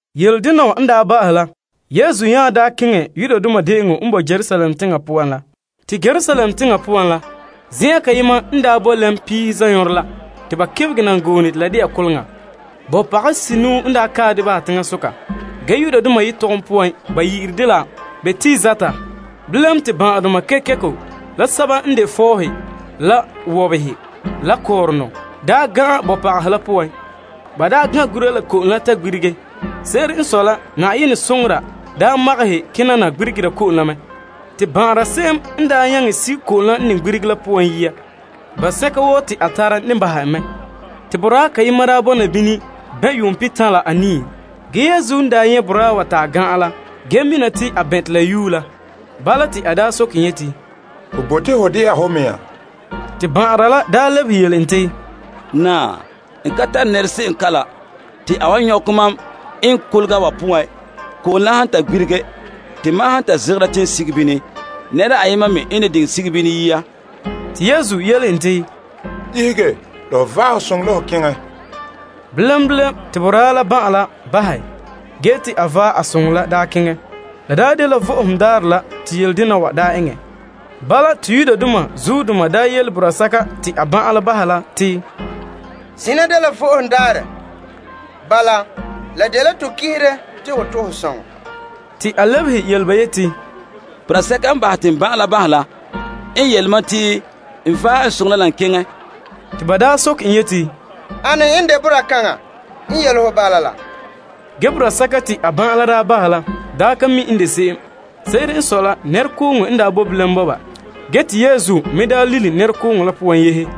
Yeledena wa n daa ba'ahɛ la, Yesu nya keŋɛ Yudoma De'eŋɔ n boe Yerusalem teŋa poan la. Te Yerusalem teŋa poan la, kolega n daa boe lɛm la Piihe Zanɔɔrɛ la. Te bɔpagahe senuu n daa kae dɛ bahɛ teŋasoka. Ge Aramaik yetɔgɔm poan ba yi'ire dɛ la Betesda. Bilam, te ban'ahedoma kekeko, la sɛba n de fɔɔhe, la wɔbehe, la kɔɔrɔnɔ daa gan'an bɔpagahe la poan. Ba daa gan' gura la ko'om la ta gbirige. Se'ere n sɔe la, Yenɛ soŋora daa magahɛ kena na gbirigera ko'om la. Te ban'anra se'em n daa nyaŋɛ sige ko'om la n gbirigere la poan yia, ban'sɛka woo te a tara ne bahɛ en mɛ. Te boraa kayema daa bɔna bini bɛn' yuum pihitan' la anii. Ge Yesu nyɛ' boraa wa ta a gan'an la mina te a bɛn' te la yue mɛ. Bala, te a soke en yeti, Ho bote ho de'a ho mɛŋa? Te ban'anra la lebehe yele en te, Naa, n ka tare nɛrese'em kalam te a wan nyɔkɛ mam eŋɛ kolega wa poan ko'om han ta gbirige. Te mam han ta zegɛra te n sige bini, nɛra ayema me n ne diŋɛ sige bini yia. Te Yesu yele en te, Ihege la ho vaɛ ho soŋɔ la ho keŋɛ. Bilam bilam, te boraa la ban'an la bahɛ, ge te a vaɛ a soŋɔ la keŋɛ. La daa dela Vo'ohogo Daarɛ. Bala, te Yudoma la yele boraa sɛka te a ban'an la bahɛ la te, Zina dela Vo'ohogo Daarɛ. Bala, la dela to kihire te ho to' ho soŋɔ. Te a lebehe yele ba yeti, Boraa sɛka n bahɛ te n ban'an la bahɛ la, n yele mam te n vaɛ n soŋɔ la n keŋɛ. Te ba soke en yeti, Ane n de boraa kaŋa yele ho te vaɛ ho soŋɔ keŋɛ? Ge, boraa sɛka te a ban'an n bahɛ la ka mi' n de se'em. Se'ere n sɔe la, nɛrekooŋɔ n daa bo bilam bɔba ge te Yesu me lilom nɛrekooŋɔ la poan yehe.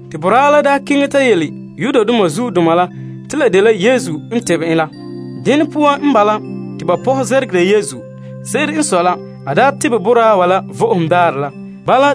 Te boraa la nya keŋɛ ta yele Yudoma la te la dela Yesu n daa tebɛ en la. Dene poan n bala, te ba pɔhɛ muguha Yesu. Se'ere n sɔe la, a tebɛ boraa wa la Vo'ohogo Daarɛ la.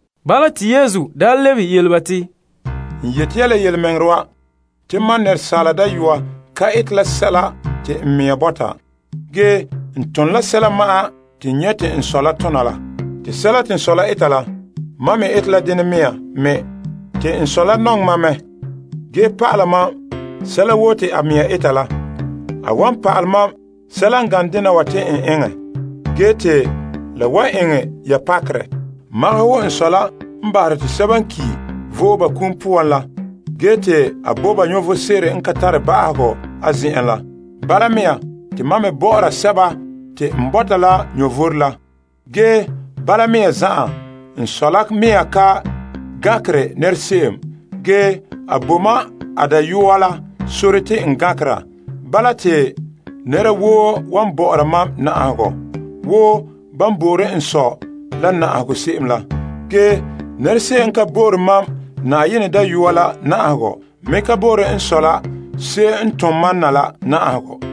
Bala, te Yesu lebehe yele ba te, N yeti ya la yelemɛŋɛrɛ wa, te mam Yenɛ Dayɔa ka ete la sɛla te n mea bɔta, ge n tone la sɛla ma'an te n nyɛ' te n Sɔ la tona la. Te sɛla te n Sɔ la ete la, mam la me ete la dene mea me. Te n Sɔ la nɔŋɛ mam la mɛ, ge pa'ala mam sɛla woo te a mea eta la. Ge, a wan pa'alɛ mam sɛla n gane dena wa te n eŋɛ, ge te la wan eŋɛ ya pakerɛ. Magahɛ wo n Sɔ la n bahere te sɛba n ki' vo'e ba kum poan la ge te a bo ba vom sebo n ka tare ba'ahegɔ a zen'en la. Bala mea, te mam me bɔ'ɔra sɛba te n bɔta la vom la. Ge bala mea zan'an, n Sɔ la mea ka gankere nɛrese'em. Ge, a bo mam a Dayɔa la sore te n gankera. Bala, te nɛra woo wan bɔ'ɔra mam na'ahegɔ, wo ban bo'ore n Sɔ la na'ahegɔ se'em la. Ge, nɛrese'em n ka bo'ore mam Yenɛ Dayɔa la na'ahegɔ me ka bo'ore n Sɔ la se'em n tom mam na la na'ahegɔ.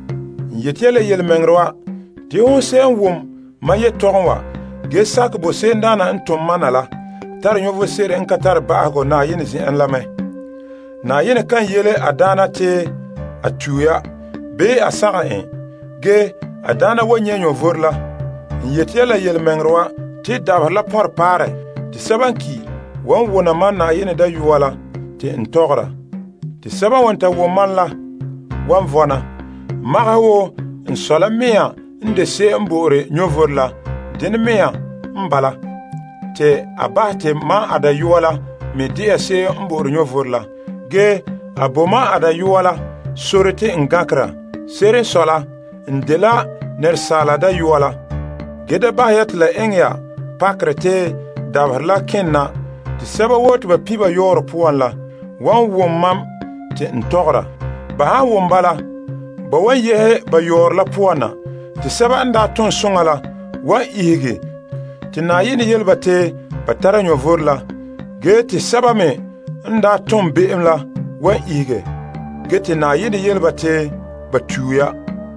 N yeti ya la yelemɛŋɛrɛ wa, te hon se'em n wom mam yetɔgɔm wa, ge sakɛ bo se'emdaana n tom mam na la, tare vom sebo n ka tare ba'ahegɔ Yenɛ zen'en la mɛ. Yenɛ kan yele a daana te a tue ya, bii a sagom en. Ge, a daana wan nyɛ' vom la. N yeti ya la yelemɛŋɛrɛ wa, te dabaherɛ la pɔnrɛ, te sɛba n ki' la wan wona mam Yenɛ Dayɔa la te n tɔgɔra. Te sɛba n wan ta wom mam la, wan vɔna. Magahɛ wo n Sɔ la mea n de se'em n bo'ore vom la, dene mea n bala, te a bahɛ te mam a Dayɔa la me de'a se'em n bo'ore vom la. Ge a bo mam a Dayɔa la sore te n gankera. Se'ere n sɔe la, n dela Asaala Dayɔa la. Ge da bahɛ ya te la eŋɛ ya pakerɛ te dabaherɛ la kene na te sɛba woo te ba pin' ba yɔɔrɔ poan la wan wom mam te n tɔgɔra. Ba han wom bala, ba wan yehe ba yɔɔrɔ la poan na. Te sɛba n tom soŋa la wan ihege te Yenɛ yele ba te ba tare vom la, ge te sɛba me n tom be'em la wan ihege, ge Yenɛ yele ba te ba tue ya.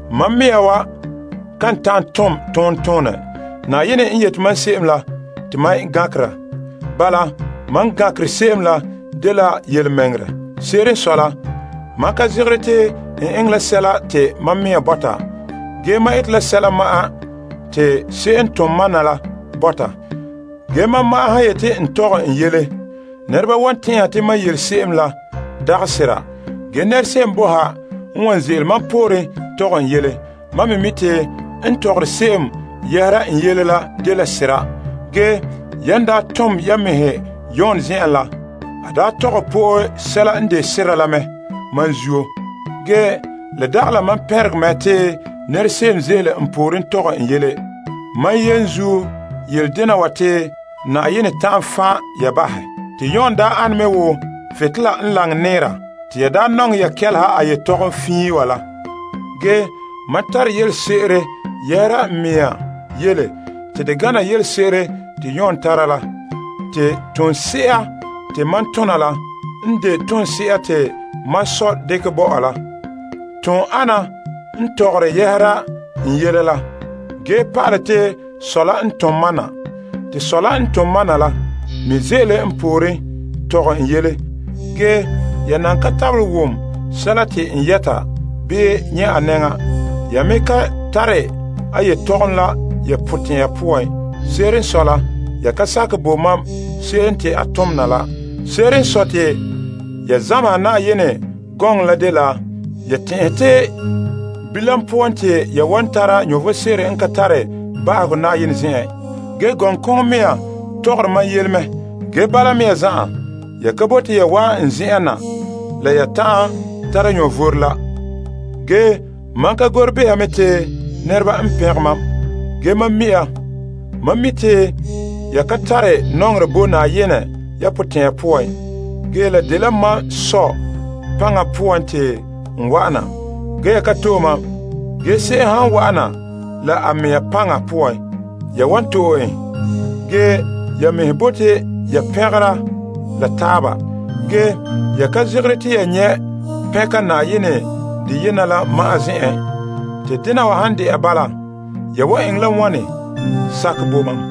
Mam mea kan ta'an tom tontonɛ, la han dagana Yenɛ. Yenɛ n yeti mam se'em la, te mam gankera. Bala, mam gankere se'em la dela yelemɛŋɛrɛ. Se'ere n sɔe la, mam ka zegere te n eŋɛ la sɛla te mam mea bɔta. Ge, mam ete la sɛla ma'an te se'em n tom mam na la bɔta. Ge, mam ma'an han yeti n tɔgɛ n yele, nɛreba wan tɛn'ɛha te mam yele se'em la dagɛ sera. Ge, nɛrese'em boe ha n wan ze'ele mam pooren tɔgɛ n yele. Mam me mi' te n tɔgɔre se'em yɛhera n yele la dela sera. Yan daa tom ya yamehe Yon zen'en la, a daa tɔgɛ po'e sɛla n de sera la mɛ mam zuo. Ge la dagɛ la mam pɛngerɛ mɛ te nɛrese'em ze'ele n pooren tɔgɛ n yele. Mam yenzuo yele dena wa te Yenɛ ta'an fan' ya bahɛ. Te daa ane me wo butolela n laŋɛ nɛɛra, te ya daa nɔŋɛ ya kelehe a yetɔgɔm fiin wa la. Ge, mam tare yelese'ere yɛhera n mea yele te de gana yelese'ere te Yon tara la. Te toonse'a te mam tom la, n de toonse'a te mam Sɔ dekɛ bo mam la. Ton'ana n tɔgɔre yɛhera n yele la, ge pa'alɛ te Sɔ la n tom mam na. Te Sɔ la n tom mam na la me ze'ele n pooren tɔgɛ n yele. Ge ya nan ka tabelɛ wom sɛla te a tɔgɔra, bii nyɛ' a naanɛ. Ya me ka tare a yelehom la ya potɛn'ya poan. Se'ere n sɔe la, ya ka sakɛ bo mam se'em te a tom na la. Se'ere n sɔe la, ya zameha Yenɛ gɔŋɔ la dela ya tɛn'ɛhe te bilam poan te ya wan tara vom sebo n ka tare ba'ahegɔ Yenɛ zen'en. Ge gɔŋkoŋɔ mea tɔgɔre mam yele mɛ. Ge, bala mea zan'an, ya ka bote ya wa'an n zen'en na la ya ta'an tara vom la. Ge mam ka gore behera te nɛreba n pɛngɛ mam. Ge, mam mi' ya. Mam mi' te ya ka tare nɔŋerɛ bo Yenɛ ya potɛn'ɛra poan. La dela mam Sɔ paŋa poan te n wa'ana. Ge, ya ka to'e mam. Ge se'em han wa'ana la a mea paŋa poan, ya wan to'e en. Ge ya mɛhe bote ya pɛngere la taaba. Ge, ya ka zegere te ya nyɛ' pɛnka Yenɛ deyena la ma'an zen'en. Te dena wa han de'a bala, ya wan eŋɛ la wane sakɛ bo mam?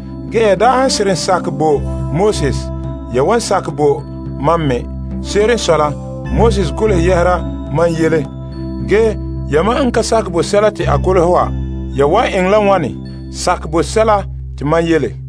Ge ya han seren sakɛ bo Moses, ya wan sakɛ ne bo mam me. Se'ere n sɔe la, Moses golehɛ yɛhera mam yele. Ge, yamam n ka sakɛ bo sɛla te a golehɛ wa, ya wan eŋɛ la wane sakɛ bo sɛla te mam yele?